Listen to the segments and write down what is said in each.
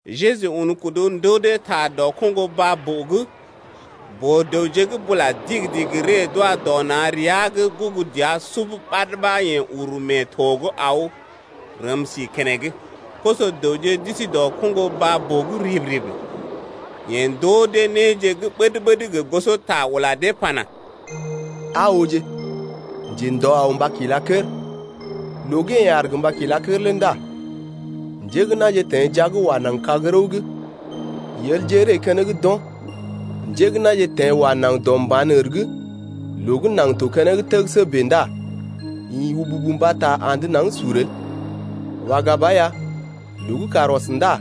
Jeju un kudu ndoo dee ta dɔ koŋgo baa-boo’g. Boo-dəwje gə́ bula digi-digi ree d’wa dɔ na̰ rəa’g gugu dəa sub ɓad ɓa yeḛ uru mee to’g aw rəm si keneŋ. Koso-dəwje d’isi dɔ koŋgo baa-boo’g rib-rib. Yeḛ ndoo dee néje gə́ ɓəd-ɓəd gə gosota ula dee pana: Aa oo, njendɔ aw mba kila kər. Loo gə́ yeḛ aar gə mba kila lé ndá njé gə́ na̰je teḛ jia’g wa naŋg kag-rəw’g: yelje ree keneŋ d’o̰. Njé gə́ na̰je teḛ wa naŋg dɔ mba̰ ər’g loo gə́ naŋg to keneŋ təgəsə bèe ndá ḭ wububu mbata andə naŋg sur el. Waga ba ya, loo gə́ kàr ɔs ndá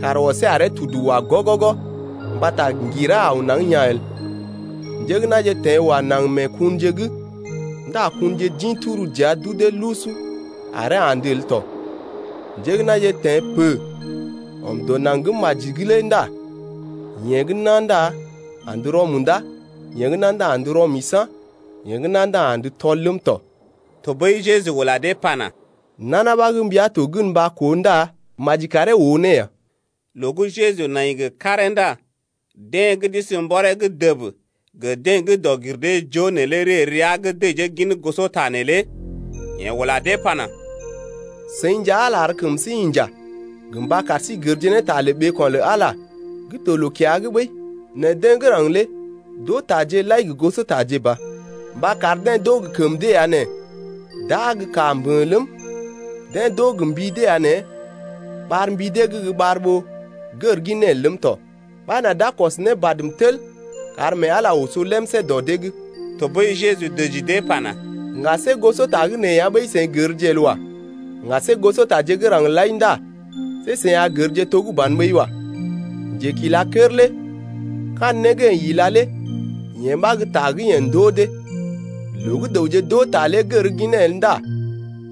kàr ɔsee aree tudu wa gɔgɔgɔ mbata ŋgira aw naŋg yaa̰ el. Njé gə́ na̰je teḛ wa naŋg mee kunje’g ndá kunje d’ḭ tur dəa d’udee lusu aree andə el tɔ. Njé gə́ na̰je teḛ pə ɔm dɔ naŋg gə́ maji’g lé ndá yeḛ gə́ nà ndá andə rɔ-munda, yee gə́ nà ndá andə rɔ-misa̰, yee gə́ nà ndá andə tɔl ləm tɔ. Tɔɓəi Jeju ula dee pana: Nana ɓa gə́ mbia to gən mba koo ndá maji karee oo ne ya. Loo gə́ yeḛ nai gə karee ndá deḛ gə́ d’isi mbɔree’g dəb gə deḛ gə́ dɔg-gir-dee-joo neelé ree rəa’g dəjee gin gosota neelé. Yeḛ ula dee pana: Seḭ nja Ala ar kəm sí inja gə mba kar sí gərje ne ta lə ɓeeko̰ lə Ala gə́ to loo-kiya’g ɓəi, nɛ deḛ gə́ raŋg lé d’oo taje lai gə gosotaje ba. Mba kar dee d’oo gə kəm dee ya nɛ d’aa gə kaa mbə̰ ləm, Deḛ d’oo gə mbi dee ya nɛ ɓar mbi dee’g gə́ ɓar ɓó gər ginee el ləm tɔ, Ɓa nà d’a kɔs ne badm tel kar mee Ala oso lemsé dɔ dee’g. Tɔɓəi Jeju dəji dee pana: Ŋga see gosota gə́ nee ya ɓəi seḭ gərje el wa. Ŋga see gosotaje gə́ raŋg lai ndá see seḭ a gərje to gə́ ban ɓəi wa. Njekilakər lé kandə né gə́ yeḛ ila lé yee ɓa gə́ ta gə́ yeḛ ndoo dee. Loo gə́ dəwje d’oo ta lé gər ginee el ndá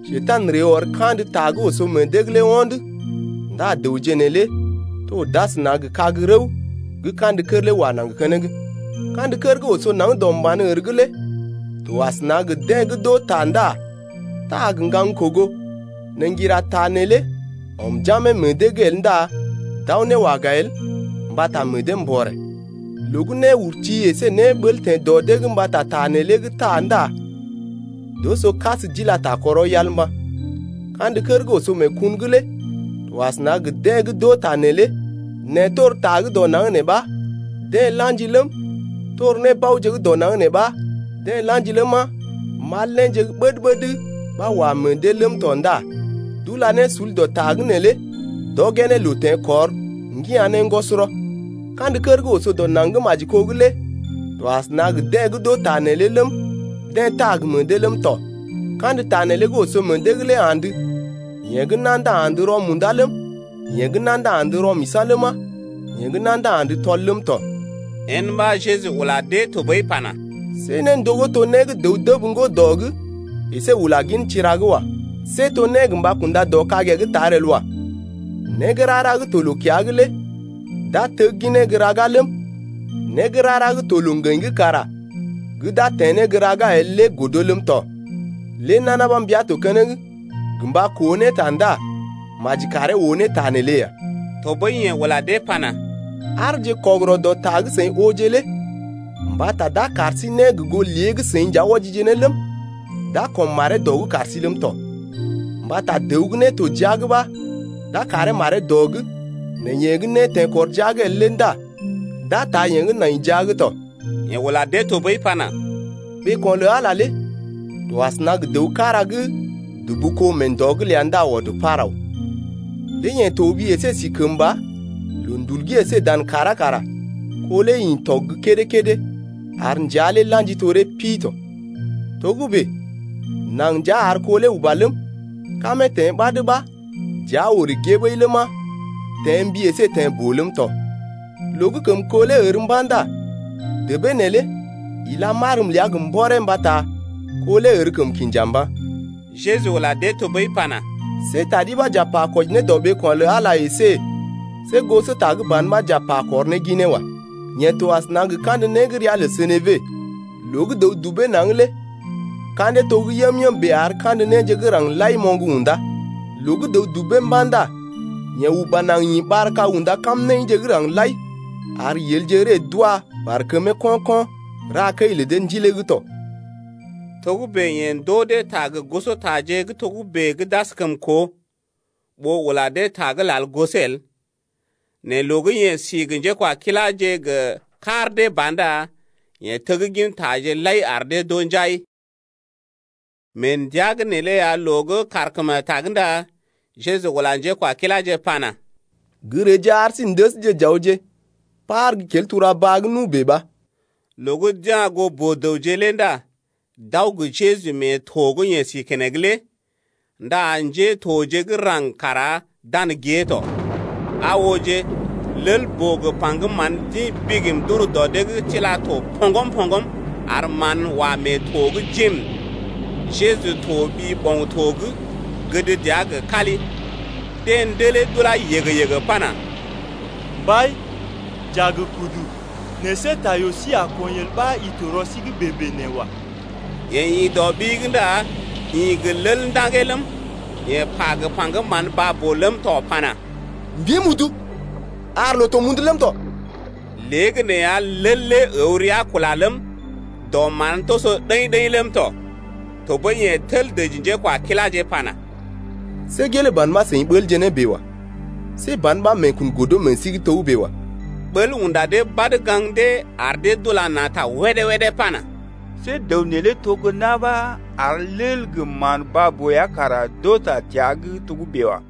Njekurai ree ɔr kandə ta nee gə́ oso meḛ dee’g lé ho̰d ndá dəwje neelé to d’asəna gə kag-rəw gə́ kandə kər lé wa naŋg keneŋ. Kandə kər gə́ oso naŋg dɔ mba̰ ər’g lé to asəna gə deḛ gə́ d’oo ta ndá taa gə ŋgaŋ-kogo, nɛ ŋgira ta neelé ɔm jamee meḛ dee’g el ndá d’aw ne waga el mbata meḛ dee mbɔrè. Loo gə́ néurti əsé néɓəl teḛ dɔ dee’g mbata ta neelé gə́ deḛ taa ndá d’oso kas d’ila ta kɔrɔ yal mba̰. Kandə kər gə́ oso mee kun’g lé to asəna gə deḛ gə́ d’oo ta neelé nɛ tor ta gə́ dɔ naŋg nee ɓa deḛ la̰ji ləm, tor nébaoje gə́ dɔ naŋg nee ɓa deḛ la̰ji ləma, mal néje gə́ ɓəd-ɓəd ɓa wa meḛ dee ləm tɔ ndá d’ula ne sul dɔ ta’g neelé d’ɔgee ne loo teḛkɔr, ŋgina ne ŋgɔsɔrɔ. Kandə kər gə́ oso dɔ naŋg gə́ maji kó’g lé to asəna gə deḛ gə́ d’oo ta neelé ləm, deḛ taa gə meḛ dee ləm tɔ. Kandə ta neelé gə́ oso meḛ dee’g lé andə, yee gə́ nà ndá andə rɔ-munda ləm, yee gə́ nà ndá andə rɔ-misa̰ ləma, yee gə́ nà ndá andə tɔl ləm tɔ. Yen ɓa Jeju ula dee tɔɓəi pana: See néndogó to né dəw dəb ŋgo dɔ’g əsé ula gin tira’g wa. See to né gə mba kunda dɔ kagee’g tar el wa. Né gə́ rara gə́ to loo-kiya’g lé d’a tegginee gə́ raga ləm, né gə́ rara gə́ to loo-ŋgəḭ’g kara d’a teḛ ne gə́ raga ləm tɔ. Lé nana ɓa mbia to keneŋ gə mba koo ne ta ndá maji karee oo ne ta neelé ya. Tɔɓəi yeḛ ula dee pana: Aarje kɔgərɔ dɔ ta gə́ seḭ ooje lé. Mbata d’a kar sí né gə goo lé gə́ seḭ nja wɔjije ne ləm, d’a kɔm maree dɔ’g kar sí ləm tɔ. Mbata dəw gə́ né to jia’g ɓa d’a karee maree dɔ’g, nɛ yeḛ gə́ né teḛkɔr jia’g el ndá d’a taa yee gə́ nai jia’g tɔ. Yeḛ ula dee tɔɓəi pana: Ɓeeko̰ lə Ala lé to asəna gə dəw kára gə́ dubu kó mee ndɔ’g ləa ndá ɔd par aw. Lé yeḛ toɓi əsé sí kəmba, loondul’g əsé dan kàrá kara kó lé ḭ tɔg gə́ kédé-kédé ar njea lé la̰ji toree pi tɔ. Togə́bè naŋg nja ar kó lé uba ləm, kamee teḛ ɓad ɓa dəa orè gée ɓəi ləma, teḛ mbi əsé teḛ boo ləm tɔ. Loo gə́ kəm kó lé ər mba̰ ndá debee neelé ila marm ləa gə mbɔree mbata kó lé ər kəm kinja mba̰. Jeju ula dee tɔɓəi pana: See ta ɗi ɓa j’a pa kwɔji dɔ ɓeeko̰ lə Ala lé əsé see gosota gə́ ban ɓa j’a pa kɔr ne ginee wa. Yee to asəna gə kandə né gə́ ria lə senebe, loo gə́ dəw dubee naŋg lé ka̰dee to gə́ yəm-yəm bèe ar kandə néje gə́ raŋg lai moŋg unda. Loo gə́ dəw dubee mba̰ ndá yee uba naŋg ḭ ɓar-kag unda kamnaḭje gə́ raŋg lai ar yelje ree d’wa barkəmee ko̰-ko̰ ra kəi lə dee ndilee’g tɔ. Togə́bè yeḛ ndoo dee ta gə gosotaje gə́ togə́bè gə́ d’askəm koo. Ɓó ula dee ta gə́ lal gosee el, nɛ loo gə́ yeḛ si gə njékwakiláje gə kar dee ba ndá yeḛ teg gintaje lai ar dee d’oo njai. Mee ndəa neelé ya loo gə́ kàrkemetag ndá Jeju ula njékwakiláje pana: Gə́ reeje ar sí n’dəsje j’awje par gə́ kel tura-baa’g nu bèe ɓa. Loo gə́ d’ya̰ goo boo-dəwje lé ndá d’aw gə Jeju mee to gə́ yeḛ si keneŋ lé, ndá njétoje gə́ raŋg kara dan gée tɔ. Aa ooje, lel-boo gə paŋgəm mán d’ḭ bigim d’ur dɔ dee’g tila to poŋgm-poŋgm, ar mán wa mee to’g jiim. Jeju toɓi ɓoŋ-to’g, gəd dəa gə kali. Deḛ ndelee d’ulá yəgə-yəgə pana: Mbai, j’a gə kudu, nɛ see ta yoo sí a kɔḭ el ɓa i to rɔ sí’g bèe-bèe nee wa. Yeḛ ḭ dɔ ɓi’g ndá ḭ gə lel ndaŋgee ləm, yeḛ pa gə paŋgəm mán baa-boo ləm tɔ pana, Mbim udu, ar loo to mundu ləm tɔ! Léegəneeya lel lé əw rəa kula ləm, dɔ mán toso ɗəḭ-ɗəḭ ləm tɔ. Tɔɓəi yeḛ tel dəji njékwakiláje pana: See gelee ban ɓa seḭ ɓəlje ne bèe wa. See ban ɓa meekun godo meḛ sí’g togə́bè wa. Ɓəl unda dee badə gaŋg dee, ar dee d’ula na̰ ta wédé-wédé pana: See dəw neelé to na̰ ɓa ar lel gə mán baa-boo ya kara d’oo ta təa’g togə́bè wa.